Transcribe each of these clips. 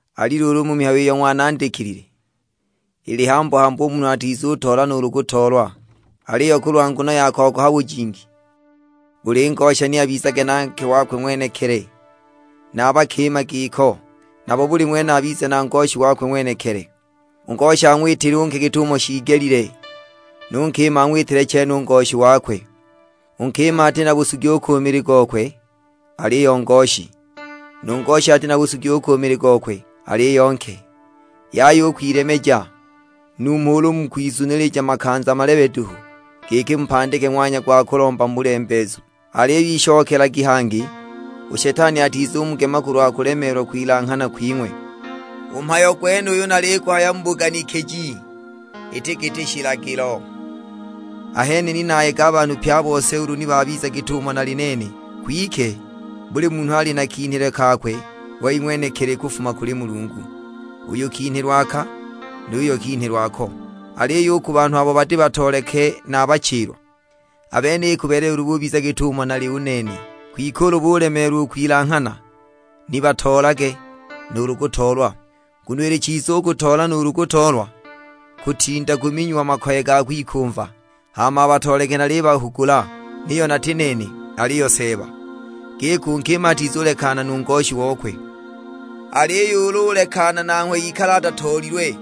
Ali luulu u mu mihayo iyo ng'wanandikilile, ili hambu-hambu u munhu atizutoola nuulu kutoolwa. Aliyo kulwa nguno ya kogoha bujingi, buli ngosha ni abizage na nke wakwe ng'wenekili, na a bakima giko; nabo buli ng'wene abize na ngoshi wakwe ng'wenekili. U ngosha ang'witile u nke git'umo shiigelile; nu nkima ang'witile chene u ngoshi wakwe. U nkima ati na busugi u ku mili gokwe, aliyo ngoshi; nu ngosha ati na busugi u ku mili gokwe, aliyo nke. Yaya u kwilemeja, numho ulu mu kwizunilija makanza malebe duhu, giki mupandike ng'wanya gwa kulomba mu bulembeezu; aliyo ishokelagi hangi, u Shetani atizumugema kulwa kulemeelwa kwilanghana kwing'we. U mhayo gwenuyu naliguhaya mu buganikiji, iti giti shilagilo. Ahene ni nayega a banhu pye a bose ulu ni babiza git'umo nali u nene; kwike buli munhu ali na kinhilwe kakwe wei ng'wenekili kufuma kuli Mulungu; uyu kinhilwe aka, nu yuyo kinhilwe ako. Aliyo u ku banhu abo bati batooleke na a bachilwa, a bene ikubeelela ulu bubiza git'umo nali u nene. Kwike ulu bulemeelwa u kwilanghana, ni batoolage nuulu kutoolwa, nguno ili chiza u kutoola nuulu kutoolwa, kutinda kuminyiwa makoye ga kwikumva. Hama a batooleke nalibahugula, niyo nati nene, aliyo Seeba; giki u nkima atizulekana nu ngoshi okwe. Aliyo ulu ulekana nanghwe ikale atatoolilwe,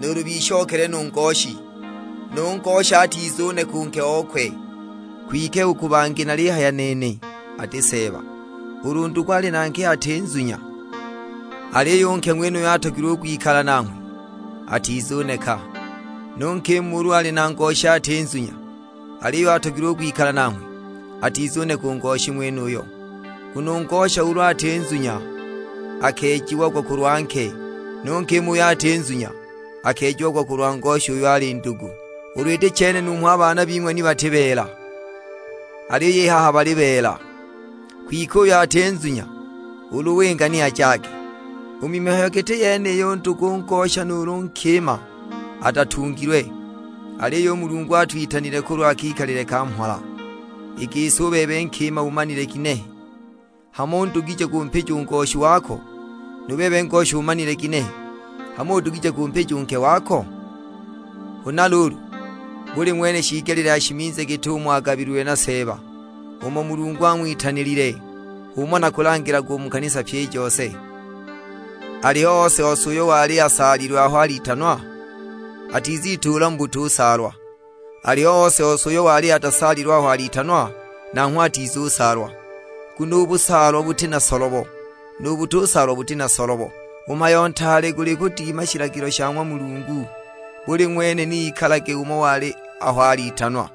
nuulu bishokele nu ngoshi; nu ngosha atizuneka u nke okwe. Kwike u ku bangi nalihaya nene, ati Seeba; ulu ndugu ali na nke ati nzunya, aliyo u nke ng'wenuyo atogilwe u kwikala nanghwe, atizuneka. Nu nkima ulu ali na ngoshi ati nzunya, aliyo atogilwe u kwikala nanghwe, atizuneka u ngoshi ng'wenuyo. Nguno u ngosha ulu ati nzunya akeejiagwa kulwa nke, nu nkima uyo ati nzunya akeejiagwa kulwa ngoshi uyo ali ndugu; ulu iti chene numho a baana bing'we ni bati beela, aliyo i haha bali beela. Kwike uyo ati nzunya ulu winga ni ajage; u mu mihayo giti yeniyo u ndugu u ngosha nuulu u nkima atatungilwe, aliyo u Mulungu atwitanile kulwa kikalile ka mhola. I gisi u bebe nkima umanile kinehe, hamo udugije kumpija u ngoshi wako; nu bebe ngosha umanile kinehe, hamo udugije kumpija u nke wako? Huna luulu, buli ng'wene shiigelile ashimize git'umo agabililwe na Seeba, umo Mulungu ang'witanilile. H'umo nakulangilaga u mu kanisa pyi i jose. Aliho ose-ose uyo wali asaalilwe aho alitanwa? Atizituula mu butusaalwa; aliho ose-ose uyo wali atasaalilwe aho alitanwa? Nanghwe atizusaalwa. Nguno u busaalwa buti na solobo, nu butusaalwa buti na solobo; u mhayo ntaale guli kudima shilagilo sha ng'wa Mulungu. Buli ng'wene ni ikalage umo wali aho alitanwa.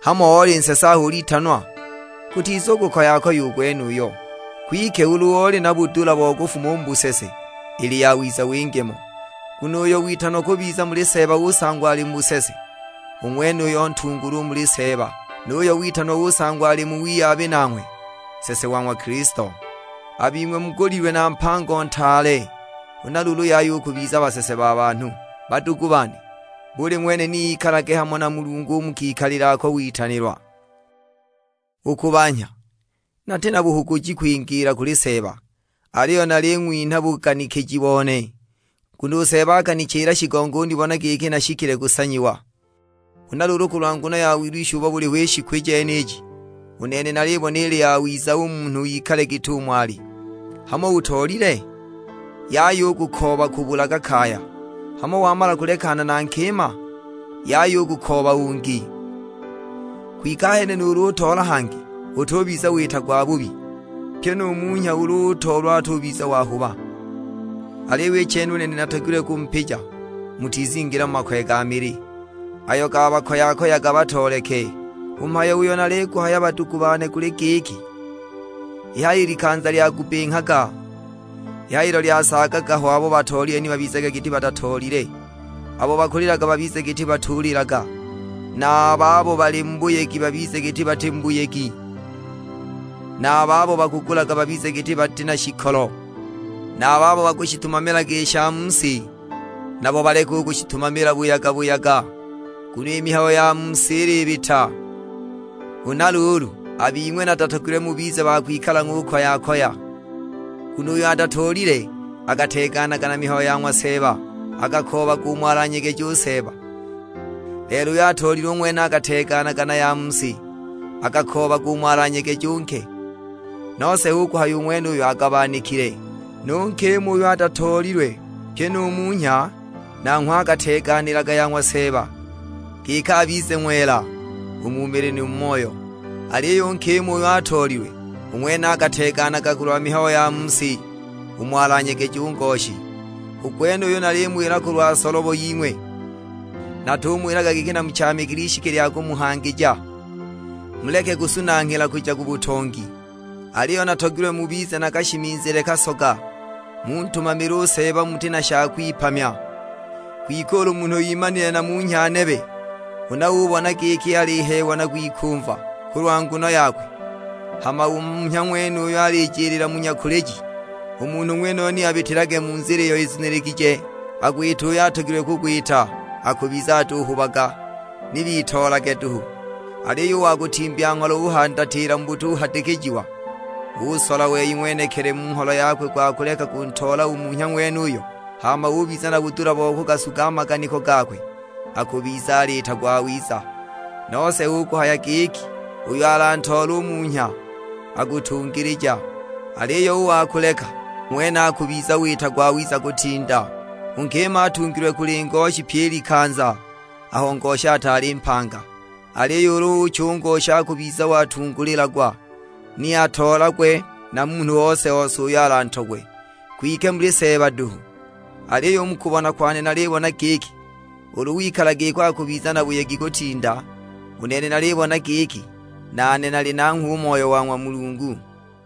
Hamo oli nsese aho ulitanwa? Gutizukukoya u gwenuyo; kwike ulu uli na budula bo kufuma u mu busese, ili yawiza winge mo. Nguno uyo witanwa kubiza muli Seeba usangwa ali mu busese, u ng'wenuyo ntungulwa u muli Seeba; nu yuyo witanwa usangwa ali mu wiyabi nanghwe nsese wa ng'wa Kilisto. A bing'we mugulilwe na mpango ntaale, huna luulu yaya u kubiza basese ba banhu. Badugu bane, buli ng'wene ni ikalage hamo na Mulungu u mu kikalile ako witanilwa. U ku banhya, nati na buhuguji kwingiila kuli Seeba, aliyo naling'winha buganikiji bone, nguno u Seeba akanichila shigongo unibona giki nashikile kusanyiwa. Huna luulu kulwa nguno ya wilwisha ubo buliho i shiku jeniji, u nene nalibona ili yawiza u munhu ikale git'umo ali. Hamo utoolile? Yaya u kukooba kubulaga kaya; hamo wamala kulekana na nkima? Yaya u kukooba ungi. Kwike ahene nuulu utoola hangi, utubiza wita gwabubi. Pyi nu munhya ulu utoolwa atubiza wahuba; aliyo i chene u nene natogilwe kumupija mutizingila mu makoye ga mili, ayo gakabakoyaga batooleke. U mhayo uyo naliguhaya badugu bane guli giki, i haha i likanza lyagubbinghaga; ilo lyasaagaga ho abo batoolile ni babizage giti batatoolile. Abo bakulilaga babize giti batulilaga, na a babo bali mu buyegi babize giti bati mu buyegi, na a babo bakugulaga babize giti bati na shikolo. Na a babo bakushitumamilaga i sha mu si, nabo baleke u kushitumamila buyaga-buyaga; nguno i mihayo ya mu si ilibita. Huna luulu, a bing'we natatogilwe mubize ba kwikala ng'ukoya-koya, nguno uyo atatoolile akateeganaga na mihayo ya ng'wa Seeba, akakoobaga umo alanyegeje u Seeba. Lelo uyo atoolile u ng'wene akateeganaga na ya mu si, akakoobaga umo alanyegeje u nke; nose hu kuhaya u ng'wenuyo agabanikile. Nu nkima uyo atatoolilwe, pyi nu munhya; nanghwe akateeganilaga ya ng'wa Seeba, giki abize ng'wela u mu mili nu mu moyo. Aliyo u nkima uyo atoolilwe, u ng'wene akateeganaga kulwa mihayo ya mu si, umo alanyegeje u ngoshi. U gwenuyu nalimuwila kulwa solobo ying'we, natumuwilaga giki namuchaamikile ishiki lya kumuhangija, muleke kusunanghila kuja ku butongi; aliyo natogilwe mubize na kashimizile kasoga, muntumamile u Seeba muti na sha kung'wipamya. Kwike ulu munhu imanile na munhya nebe huna ubona giki aliheewa na kwikumva kulwa nguno yakwe, hama u munhya ng'wenuyo alijiliila mu nyakuliji, u munhu ng'wenuyo ni abitilage mu nzila iyo izuniligije, agwite uyo atogilwe kugwita; akubiza atuhubaga, ni bitoolage duhu. Aliyo u wa kutimbya ngholo uhandatila mu butuhadikijiwa, usola wei ng'wenekili mu ngholo yakwe gwa kuleka kuntoola u munhya ng'wenuyo, hama ubiza na budula bo kugasuga a maganiko gakwe, akubiza aliita gwawiza. Nose hu kuhaya giki uyo alantoole u munhya akutungilija, aliyo u wa kuleka, u ng'wene akubiza wita gwawiza kutinda. U nkima atungilwe kuli ngoshi pyi i likanza aho ngoshi ataali mpanga, aliyo ulu ucha u ngoshi akubiza watungulilagwa, ni atoolagwe na munhu ose-ose uyo alantogwe; kwike muli Seeba duhu. Aliyo u mu kubona kwane nalibona giki, ulu wikala giko akubiza na buyegi kutinda: u nene nalibona giki, nane nali nanghwe u Moyo wa ng'wa Mulungu.